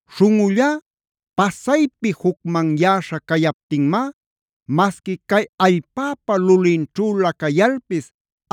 Śhunꞌullá pasaypi jucmanyäśha cayaptinmá masqui cay allpäpa lulinćhülä cayalpis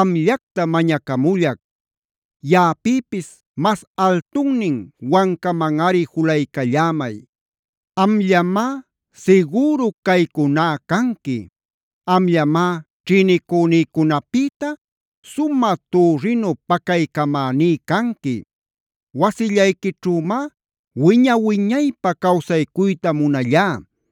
amllacta mañacamullac. Yaꞌapïpis mas altunnin wancamanꞌari julaycallämay. Amllamá sigüru caycuná canqui. Amllamá ćhïnicünïcunapïta sumä türrinu pacaycamäní canqui. Wasillayquićhümá wiña-wiñaypä cawsaycuyta munallá.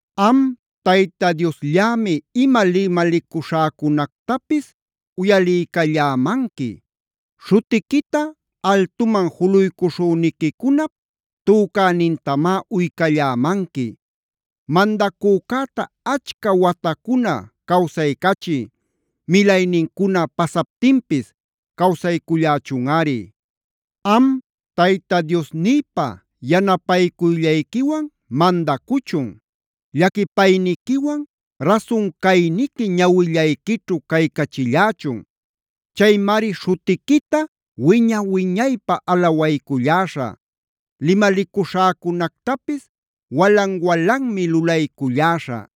Am Tayta Diosllämi ima limalicuśhäcunactapis uyaliycallämanqui. Śhutiquita altuman juluycuśhüniquicunap tücänintamá uycallämanqui. Mandacücäta achca watacuna cawsaycachiy. Milaynincuna pasaptinpis cawsaycullächunꞌari. Am Tayta Diosnïpa yanapaycuyllayquiwan mandachun. Llaquipayniquiwan rasun cayniqui ñawillayquićhu caycachillächun. Chaymari śhutiquita wiña-wiñaypä alawayculläśhä. Limalicuśhäcunactapis walan-walanmi lulayculläśhä.